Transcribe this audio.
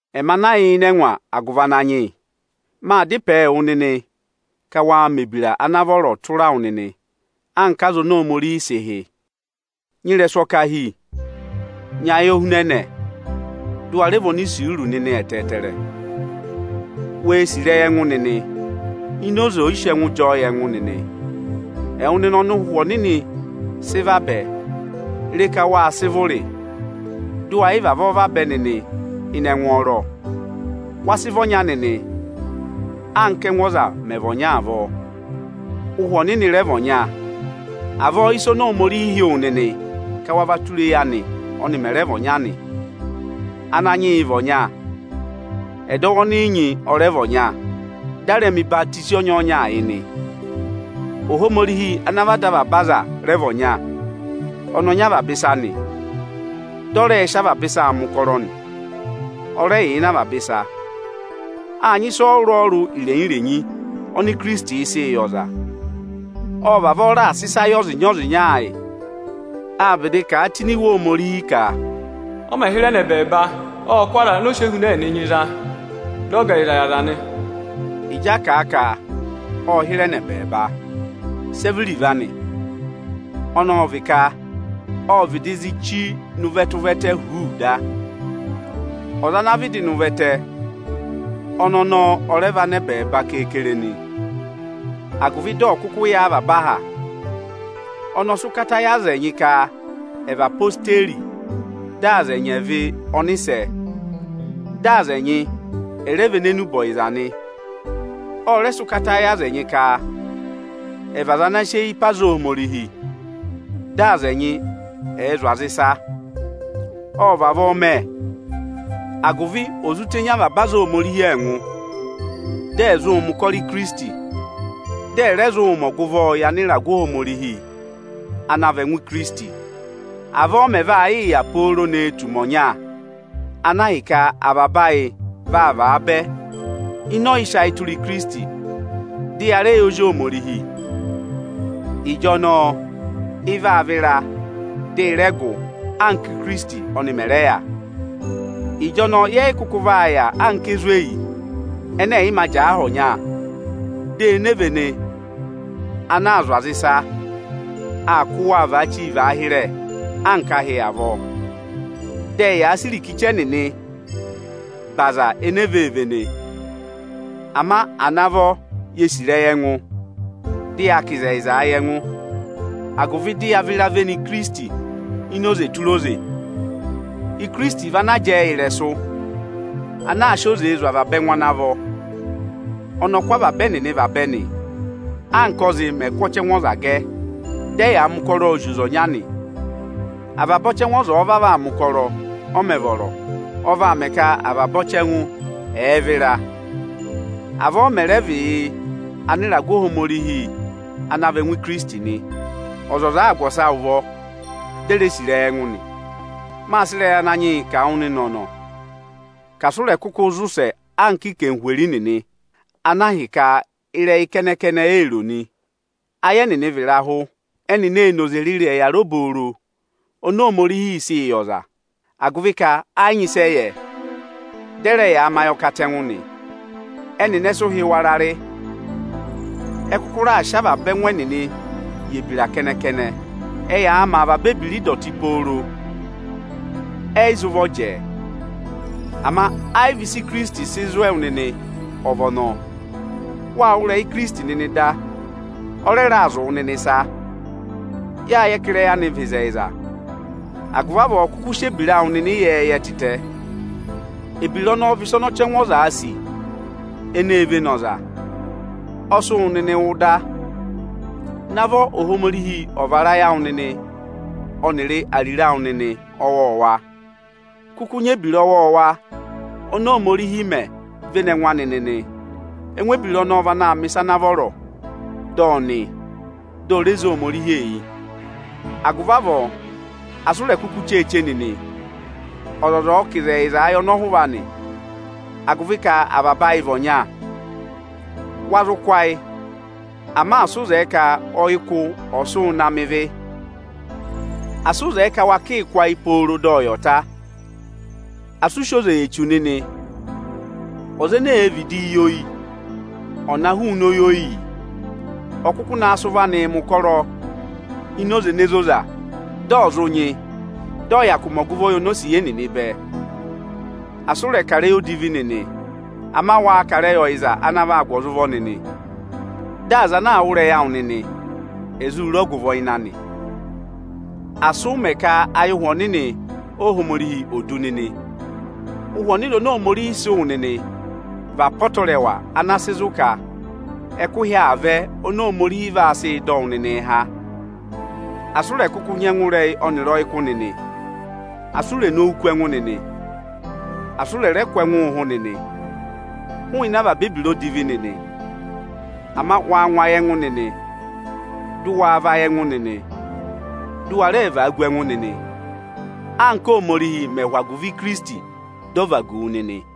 Ẹmị ana yà ịnị ẹngwa agụvị Ananyị yị maa dá ịpẹẹ wụ nịnị ka waa mẹ̀ ebira ana vọrọ tụra wụ nịnị anka aza oni Ohomorihi sị hị́. Nyị ịrẹsụ ọkahi, nyị ayohunẹnẹ, dị ụ wa rẹ vị onisuuru nịnị ẹtẹẹtẹrẹ. Wee sì ịrẹyị ẹngụ nịnị ini oze ọyịsị ẹngụ jị ọọ yị ẹngụ nịnị. Ẹwụ nịnị ọnị Ụhwẹ Ọnịnị sị vabẹ, re ka wáa sị vụrị dị ụ wa yị vavọọ vabẹ nịnị ịnị ẹngwọọrọ! Wa sị vị ọnya nịnị, anka ẹ́ngụ ọza mẹ̀ vị ọnya avọọ. Ụhwẹ Ọnịnị rẹ vị ọnya. Avọọ ị́sa oni Ohomorihi hị́ wụ nịnị ka wa vaa tụra eyi anị ọnị mẹ̀ rẹ vị ọnya nị. Ananyị yị vị ọnya, ẹdọwụ ọnị ị nyị ọ rẹ vị ọnya, dị a rẹ mẹ̀ ọyịhwọzenyi ọnyọọnyaa yị nị. Ohomorihi ana vị Ada avaba aza rẹ vị ọnya. Ọnị ọ nyị avaba ịsa nị, dị ọ rẹẹ̄ sị avaba ịsaa mẹ̀ ụkọrọ nị. Ọ rẹ yà ịnị avaba ịsa. Áa nyị ịsa ọrụrụ-ọrụrụ irenyi-irenyi oni Ikirisitiī sịị yị ọza. Ộ vavọọ raà sị ịsa yị ọzịnya-ọzịnya ayị. Â vịdị kà a tụ́ ini Iwe Ohomorihi ka, “Ọ mẹ̀ hịrẹ nọ ẹbẹẹba, ộ kụ́ aza ọnị ọ sị ehuna ẹnịnị nyị za, dị ọ gà ẹyịza yị aza nị.” Ịjị a kà a ka, “ộ hịrẹ nọ ẹbẹẹba”, sẹ vị iruvo anị? Ọnọọ ọ vị ka ô vịdị zi chí nọ ụvẹtẹ-ụvẹtẹ huuu da. Ọza ana vịdị nọ ụvẹtẹ, ọnị ọnọọ ọ rẹ và nọ ẹbẹẹba keekere nị, agụvị dị ọ̀ kụkụ yà avaba aha. Ọnị ọ sị ụkata yị aza ẹnyị ka ẹ̀ vị odeyi, dị aza ẹnyị ẹ̀ vị ọnịsẹ, dị aza ẹnyị ẹ̀ rẹ vị enenubọyịza nị. Ọ rẹ sị ụkata yị aza ẹnyị ka ẹ̀ vị aza ana sị eyi pe aza Ohomorihi, dị aza ẹnyị ẹ̀ẹ zụ̀ aza ịsa nị. Ộ vavọọ mẹ, agụvị ò zụ tenyi avaba aza Ohomorihi ẹngụ, dị ẹ̀ zụụ mẹ̀ ụkọrọ Ikirisiti, dị ẹ̀ rẹ zụụ mẹ ọgụvọọ yị (anịragụ Ohomorihi ana vị) ẹngụ Ikirisiti. Avọọ ọ mẹ̀ vaa yịị yà pooro ne tù ụmẹ ọnya, ana ahịka avaba ayị vaa vaabẹ ịnị ọyịsị ayị tụra Ikirisiti, dị ya rẹ yẹ Ozi Ohomorihi. Ịjọnọọ ị vaa vịra, dị i rẹ gụ, anka Íkirisiti ọnị mẹ̀ rẹ yà. Ịjọnọọ, yẹ yị kụkụ vaa yà anka ezweyi ẹnẹ ẹ̀ yị mā jẹẹ aha ọnya, dị enevene ana aa zụ̀ aza ịsa aa kụ́ waa vaa chíi vaa hịrẹ anka ahị avọọ. Dị ẹyaa sị irikichi ẹnịnịị be aza enee vee vene. Ama à navọ yee sì ịrẹyị ẹngụ, dị yaa kà ịzẹyịzaa yị ẹngụ, agụvị dị yaa vịraa véné Ikirisiti ini oze tụra oze! Ikirisiti vị ana jẹẹ yị ịrẹsụ, ana aa sị oze zụ̀ avaba ẹngụ ana vọ. Ọnị ọ kụ́ avaba ẹnịnị vabẹ nị, anka ọ́zị mẹ̀ kụ́ ọchẹngụ ọza gẹ. Dị ẹyaa mẹ ụkọrọọ zị oze ọnya nị. Avaba ọchẹngụ ọza ọ̀ọ vavọọ aa mẹ̀ ụkọrọ, ọ mẹ̀ vọrọ, ọ vaa mẹ ka avaba ọchẹngụ ọ̀ọ vịra. Avọọ ọ mẹ̀ rẹ vị yị (anịragụ Ohomorihi ana vị) ẹngụ Ikirisiti nị, ọzọza àa gụ ọsa ụvọ, di e ree sì ịrẹyị ẹngụ nị. Maa sị ịrẹha Ananyị yị kà wụ nịnị ọ̀nọ̀ ka asị ụ rẹ̀ kụkụ zị ụsẹ anka anarịmadọwụ nịnị, ana ahịka ịrẹyị kẹnẹ-kẹnẹ eē ro nị. Ayị ẹnịnị vị ịrahụ; ẹnịnị ẹ́ yị nyị tụ́ ịnị ẹhẹ obooro oni Ohomorihiī sịị yị ọza, agụvị ka ẹ yị nyị ịsị ẹ yẹ, dị ẹ rẹ yaa mẹ ayọkatẹngụ nị. Ẹnịnị ẹ sị ụhị wara rị. Ẹ kụkụ raà sị avaba ẹngụ ẹnịnị yị ebira kẹnẹ-kẹnẹ. Ẹyaa mẹ avaba ebira ịdọtị pooro, ẹ yị za ụvọ jẹẹ. Ama ẹ yị vị ịsị Ikirisiti sị zụ̀ ẹwụ nịnị ọ vị ọnọọ. Wâ wụ́ ịrẹyị Ikirisiti nịnị da, ọ rẹ raà zụ̀ wụ nịnị ịsa. Yáa yẹ ka ịrẹyị anị vị ịzẹyịza. Agụvị avọọ kụkụ sị ebira awụ nịnị ịyẹẹyẹ tịtẹ! Ebira ọnọọ vị ịsa ọnị ọchẹngụ ọzaā sì eneē vene ọza; ọ sị wụ nịnị wụ da. Navọ Ohomorihi ọ̀ vara ayị awụ nịnị ọnịrị ariro awụ nịnị ọwọọwa. Kụkụ nyị ebira ọwọọwa oni Ohomorihi mẹ véné ẹngụ anị nịnị! Ẹngụ ebira ọnọọ vị anaā mẹ̀ ịsa ana vọrọ, dị ọ́ nị, di o re zé Ohomorihi eyi. Agụvị avọọ, asị u rè kuku cheeche nịnị! Ọzọza ọ̀ọ kà ịzẹyịzaa yị ọnọhụva anị, agụvị ka avaba ayị vị ọnya. Wa zụ kụ́ ayị, ama asị ụ zẹẹ ka ọyịkụ ọ̀ sị wụ na mẹ ịvị! Asị ụ zẹẹ ka wa kịị kụ́ ayị pooro dị ọyị ọ̀ ta. Asị ụ sị oze yị Echu nịnị! Ọza eneē vidii yi oyi, ọ̀ na hụụnị oyi oyiyi! Ọ̀ kụkụ naa sị ụvọ anịị mẹ̀ ụkọrọ ini oze ene zoza, dị ọ̀ zụ nyị, dị ọ̀ hyakụụ mẹ ọgụvọọ yị onosiye nịnị bẹẹ! Asị ụ rẹ̀ kà ịrẹyị odivi nịnị! Ama waa kà ịrẹyị ọyịza ana vaa gụ aza ụvọ nịnị, dị aza ana aa wụ́ ịrẹyị awụ nịnị, è zụ re ọgụvọ ịnị anị. Asị ụ mẹ ka ayị Ụhwẹ Ọnịnị Ohomorihi ò du nịnị! Ụhwẹ Ọnịnị oni Ohomorihi sị wụ nịnị vị apọtẹrẹwa ana sị zụ̀ ka ẹkụhị aa vẹ oni Ohomorihi vaa sị dọ wụ nịnịị há. Asị ụ rẹ̀ kụkụ nyị ẹngụrẹyị ọnịrị ọyịkụ nịnị! Asị u rè nowu kú ẹngụ nịnị, asị ụ rẹ̀ rẹ kụ̀ ẹngụ ụhụ nịnị! Hụụnị avaba ebira odivi nịnị! Ama waa ngụ ayị ẹngụ nịnị, dị ụ waa vayị ẹngụ nịnị, dị ụ wa rẹẹ vagu ẹngụ nịnị, anka Ohomorihi mẹ̀ hụ agụvị Ikirisiti dị ọ vagu wu nịnị.